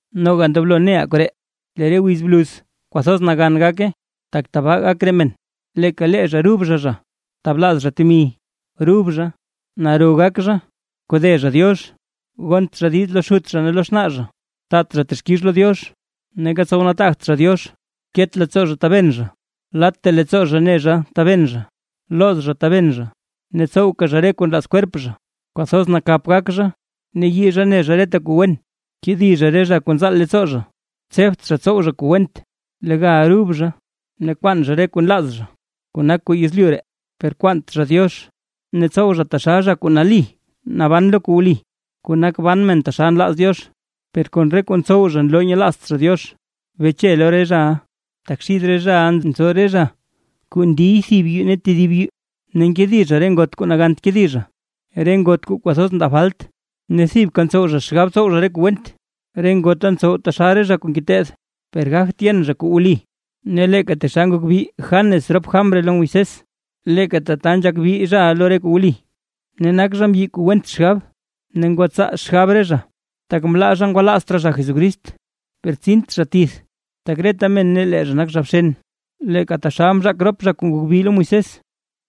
Noga ndoblo neʼa koree: Lee re wiz bluz kwathoz nagan gak, tak tabaa gak re men: leeka lee zha rub zha zha, tablaaz zha temi, rub zha, naro gak zha, kode zha Diox, gont zha diiz lo xut zha ne lo xnaa zha, taat zha texkix lo Diox, neeka tsow nataagt zha Diox. Ket leettsoo zha taben zha, latta leettsoo zha ne zha taben zha, looz zha taben zha, ne tsowka zha re kuu nlaaz kwerp zha, kwathoz nakap gak zha, ne yii zha ne zha reta kuu wen, kedi zha re zha kuu nzaal leettsoo zha, tsebt zha tsow zha kuu went, legal ndrub zha, ne kwaan zha re kuu nlaaz zha kuu nak kuu yezlyu ree, per kwaant zha Diox. Ne tsow zha taxal zha kuu nali naban lo kuu wli, kuu nak ban men taxal nlaaz Diox, per kon re kuu ntsow zha nloo nyelaazt zha Diox. Beche lo re zhaʼa. Tak xid re zhaʼa nzo re zha kuu ndiy thib yuu tedib yuu, ne nkedi zha re ngot kuu nagant kedi zha, re ngot kuu kwathoz ndaa falt, ne thibka ntsow zha xgab tsow re kuu went. Re ngota ntsow taxal zha kuu ngeteed, per gagt yen zha kuu wli. Ne leeka taxal ngok bi Janes rop Jambres lo Moisés, leeka tata nzhak bi re zhaʼa lo kuu wli. Ne nak zha mbyi kuu went xgab, ne ngwatsaa xgab re zha, tak mlaa zha ngwalaazt raa zha Jesucrist. Per tsint zha tith, tak reta men ne lee zha nak zha bxen, leeka taxal mzhaak rop zha kuu ngok bi lo Moisés.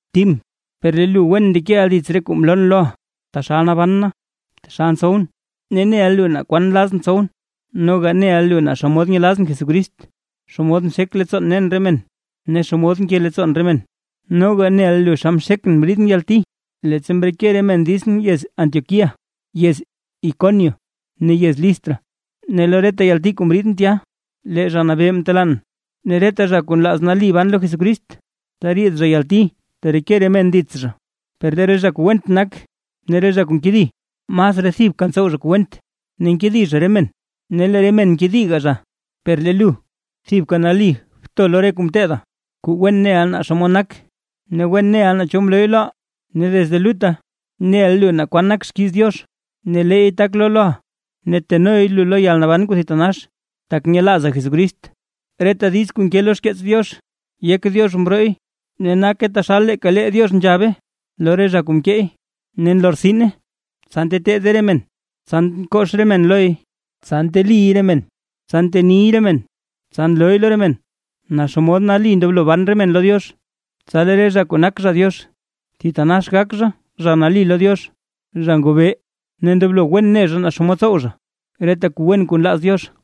Tim, per lee lu wen ndekeʼa dits re kuu mloon loʼa taxal naban na, taxal tsowʼn ne neʼa lu naa kwan nlazʼn tsowʼn. Noga neʼa lu naa xomod nyelazʼn Jesucrist, xomod nxek leettsoon nen re men, ne xomod nke leettsoon re men. Noga neʼa lu xa mxekʼn mriidʼn yalti, leettsa mreke re men ditsʼn yez Antioquía, yez Iconio ne yez Listra, ne lo reta yalti kuu mriidʼn tya, lee Zha Nabee mtelaan. Ne reta zha kuu nlaaz nali ban lo Jesucrist, teriid zha yalti tereke re men dits zha. Per lee re zha kuu went nak, ne re zha kuu nkedi, masraa thibka ntsow zha kuu went ne nkedi zha re men ne lee re men nkediga zha. Per lee lu, thibka nali bto lo re kuu mteeda, kuu wen neʼa naa xomod nak. Ne wen neʼa naa cho mlooy loʼa. Ne desde lutta, neʼa lu naa kwan nak xkiiz Diox. Ne leey tak loo loʼa, ne tenoy lu lo yalnaban kuu thitanax, tak nyelaaza Jesucrist. Reta diiz kuu nke lo xkeets Diox, yek Diox mbrooy ne nake taxal leeka lee Diox nzhabe lo re zha kuu mkeey, ne nlortsine: tsa nteteede re men, tsa nkox re men loy, tsa nteliy re men, tsa nteniy re men, tsa nlooy lo re men naa xomod nali ndoblo ban re men lo Diox. Tsa lee re zha kuu nak zha Diox, thitanax gak zha, zha nali lo Diox, zha ngobee ne ndoblo wen ne zha naa xomod tsow zha, reta kuu wen kuu nlaaz Diox.